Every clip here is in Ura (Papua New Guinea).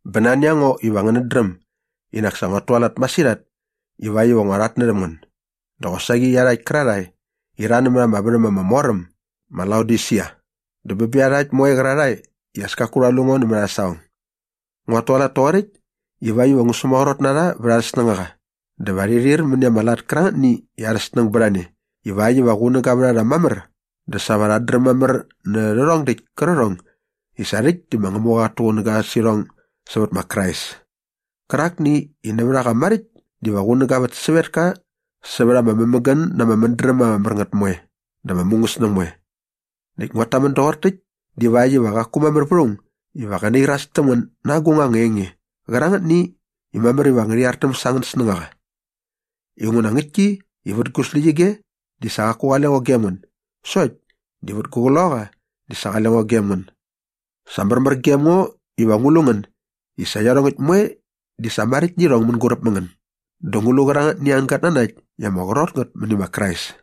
Bä nani a ngo iva ngänät dräm i nak sa nguat tualat masirhat ivakt iva ngua rhatnärhäm ngän dä qosaqi iarhakt kärarhae i rha nämät ama värhäm ama mor äm ma Laodisia dä bä bä iarhakt moe qärarhae i as kaku rha lu ngo nämät arhä saqong. Nguat tualat toqoräkt ivakt iva ngu sämaqrot na rha vät arhä snängaqa dä va rhi rhir mäni ama lat kärangätni i arha snäng bät a ne ivakt iva qunäga vät a rha mamär dä sa va rhat dräm mamär nä rhärhong däkt kärqärhong i sa rhäkt di ma Ngämuqa qat tuqunäga sä irhong sävät ma Krais kärakni iva nävät a qa maräkt diva qunäga vät sävetka sävät ama mämägän na ama mädräm ama mär ngät moe dä ama mungäsnäng moe. Näkt nguat tamän doqor täkt divakt iva qaku mamär vät aung iva gä nairas täm ngän na agung anga enge qärangätni i mamär iva ngärhi artäm sa angän snängaqa. Inguna ngäktki i vät gu släqyige di sa qaku qale ngo gem ngän sokt di vät gu qloqaqa di sa qale ngo gem ngän. Sa märmär gem ngo iva ngu lu ngän i sa iarhongäkt moe di sa maräkt nä irhong mänguräp mä ngän dä ngu lu qärangätni angän gatnanakt i ama qrot ngät mäni ma Krais.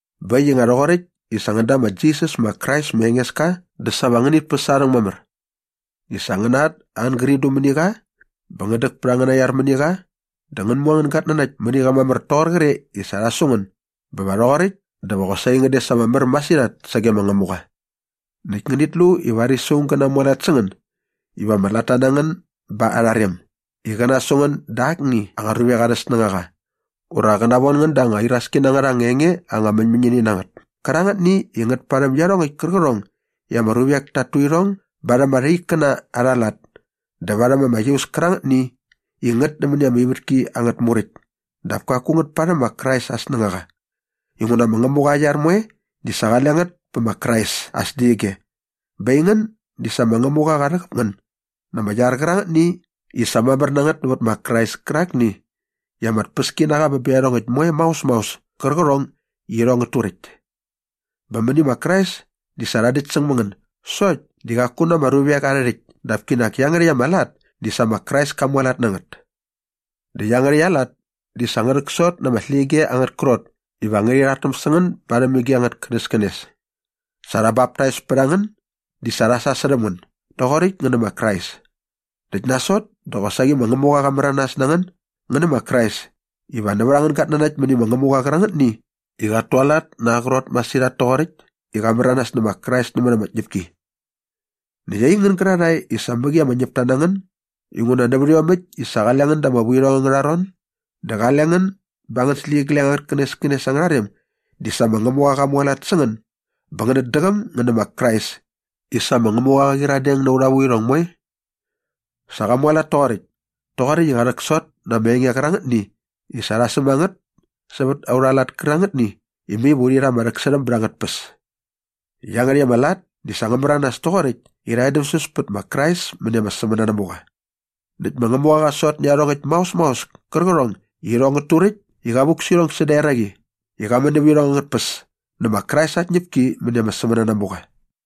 Bä äkt i nga rhoqoräkt i sa ngän da ma Jisas ma Krais ma Engeska dä sa va ngänit päs aa rhäng mamär i sa ngäna at angän gridru mäni qa bä ngän däk pät angäna iar mäni qa dä ngän mu angän gatnanakt mäni qa mamär toqor qre sa rha su ngän bä va rhoqoräkt dä va qosaqi ngän des ama mär masirhat sage ma Ngämuqa. Näkt ngänit lu i varis aung gä namualat sä ngän iva ama latta na ngän ba arha rem i qä nasu ngän da akni anga ruvek arhä snängaqa ura qä navon ngän da anga iraski na ngät anga enge anga mäñmäñini na ngät kärangätni i ngät parhäm iarhongäkt kärqärhong i ama ruvek ta tu irhong barhäm arha ikkäna arha lat dä varhäm ama iaus kärangätni i ngät nämäni ama ivätki angät muräkt dap kaku ngät parhäm ma Krais aa snängaqa. Inguna ma Ngämuqa aa iar moe di sa qale ngät pä ma Krais aa släqyige bä aingän di sa ma Ngämuqa qa rhäqäp ngän na ama iar qärangätni i sa mamär na ngät nävät ma Krais kärakni i ama tpäski na qa bä bä iarhongäkt moe maos maos kärqärhong i irhong ngät turäkt. Bä mäni ma Krais di sa rha däktsäng mä ngän sokt di qaku na ama ruvek arhä rhäkt dap kinak iangärhäkt ama lat di sa ma Krais ka mualat na ngät. Dä iangärhäkt aa lat di sa ngä rhäksot na ama släqyige angät krot iva ngärhi rhartäm sä ngän barhäm ige angät känäskänes. Sa rha baptais pät a ngän di sa rha sasärhäm ngän doqoräkt ngän nä ma Krais. Näkt nasot dä qosaqi ma Ngämuqa qa märanas na ngän ngän nä ma Krais i nävät angän gatnanakt mäni ma Ngämuqa qärakni i qat tualat na aa qrot masirhat toqoräkt i qa märanas nä ma Krais nämät ama tñäpki. Näkt aingän gärarhae i sa mäqi ama ñäpta na ngän inguna nävät iomäkt i sa qale ngän da ama vuirhong angärha ron dä qale ngän ba angän släqyigleng angät känäskänes angärha rem di sa ma Ngämuqa qa mualat sä ngän bä ngänät däqäm ngän nä ma Krais i sa ma Ngämuqa qa qyiradeng na aurha vuirhong moe. Sa qa mualat toqoräkt toqoräkt i qa rhäksot na ama enge kärangätni i sa rha säm a ngät sävät aurha lat kärangätni i mai va urhi rha ama rhäksärhäm bät angät tpäs. Iangärhäkt ama lat di sa ngä märanas toqoräkt i rha edämsäs pät ma Krais mäni ama sämänanamuqa. Näkt ma Ngämuqa qa sot nä iarhongäkt maos maos kärqärhong i irhong ngät turäkt i qa vuk sä irhong säda eraqi i qa män nävä irhong angät tpäs nä ma Krais aa tñäpki mäni ama sämänanamuqa.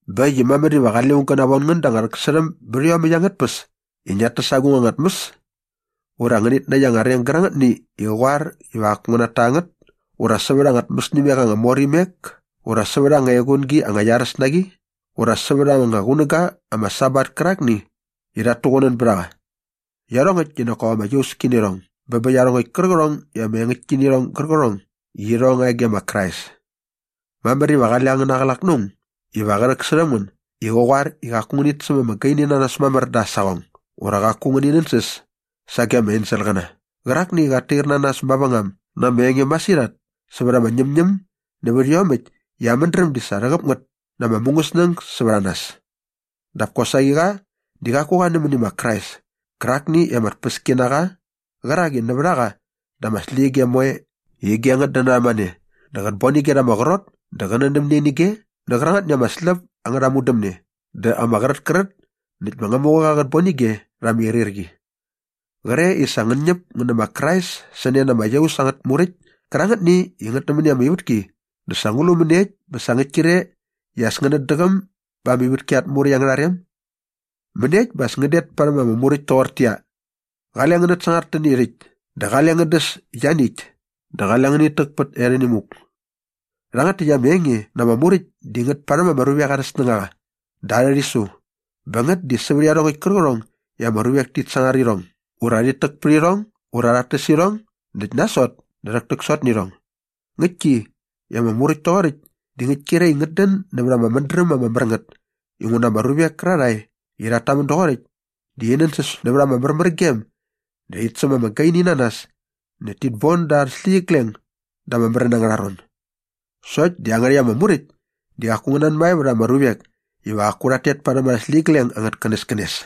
Bä äkt i mamär iva qale aung gä navon ngän da anga rhäksärhäm bät iomäkt angät tpäs i ngiat täs agung anga tmäs ura ngäni näkt anga reng gärangätni i qä qoar iva qaku ngi nata ngät ura sävät anga tmäsimek ama mor imek ura sävät anga equngi anga iaräs na qi ura sävät anga qunäga ama Sabat kärakni i rhat tuqunän bät a qa. Iarhongäkt di nak kop ama iauski nä irhong bä bä iarhongäkt kärqärhong i ama engäktki nä irhong gärqärhong i irhong nga e ge ma Krais. Mamär iva qale angäna qlak na aung iva qä rhäksärhäm ngän i qä qoar i qaku ngänit säm ama gaini na nas mamär da aa saqong ura qaku ngäni nänsäs sage ama enselqäna qärakni i qat tair na nas mavängam na ama enge masirhat sävät ama ñämñäm nävät iomäkt i aa mädräm di sa rhäqäp ngät na ama mungäsnäng sävät a nas. Dap kosaqi qa di qaku qa nämäni ma Krais kärakni i ama tpäski na qa qärak i nävät a qa dä ama släqyige moe ige ngät dän narhämane dä qät bon ige rha ama qrot dä qä nändämne nä ige nä qärangätni i ama släp angärha mudämne dä ama qrätkrät näkt ma Ngämuqa qät bon ige rha ama irhirqi. Qre i sa ngän ñäp ngän nä ma Krais sä ne na ama iaus angät muräkt kärangätni i ngät nämäni ama ivätki dä sa ngu lu mäniekt bä sa ngäkt kre i as ngänät däqäm ba ama ivätki at muräkt angärha rem? Mäniekt bä as ngän det parhäm ama muräkt toqortäqyia, “Qale ngänät sangar täni rhäkt” dä “Qale ngän däs ianiäkt” dä “Qale ngänit täk pät erhäni muk.” Rhangät täkt ama enge na ama muräkt di ngät parhäm ama ruvek arhä snängaqa dä arhä rhisu bä ngät di sävät iarhongäkt kärqärhong i ama ruvek tit sangar irhong ura rhit täk pät irhong ura rhat täs irhong näkt nasot dä rhäktäksot nä irhong. Ngäktki i ama muräkt toqoräkt di ngäkt kre i ngät dän nävät ama mädräm ama mär ngät inguna ama ruvek kärarhae i rhat tamän doqoräkt di rhi nänsäs nävät ama märmärgem dä rhit säm ama gaini na nas näkt tit bon da arhä släqyigleng da ama märän angärha ron. Sokt di iangärhäkt ama muräkt di qaku ngä nanmae vät ama ruvek iva qaku rhat tet parhäm arhä släqyigleng angät känäskänes.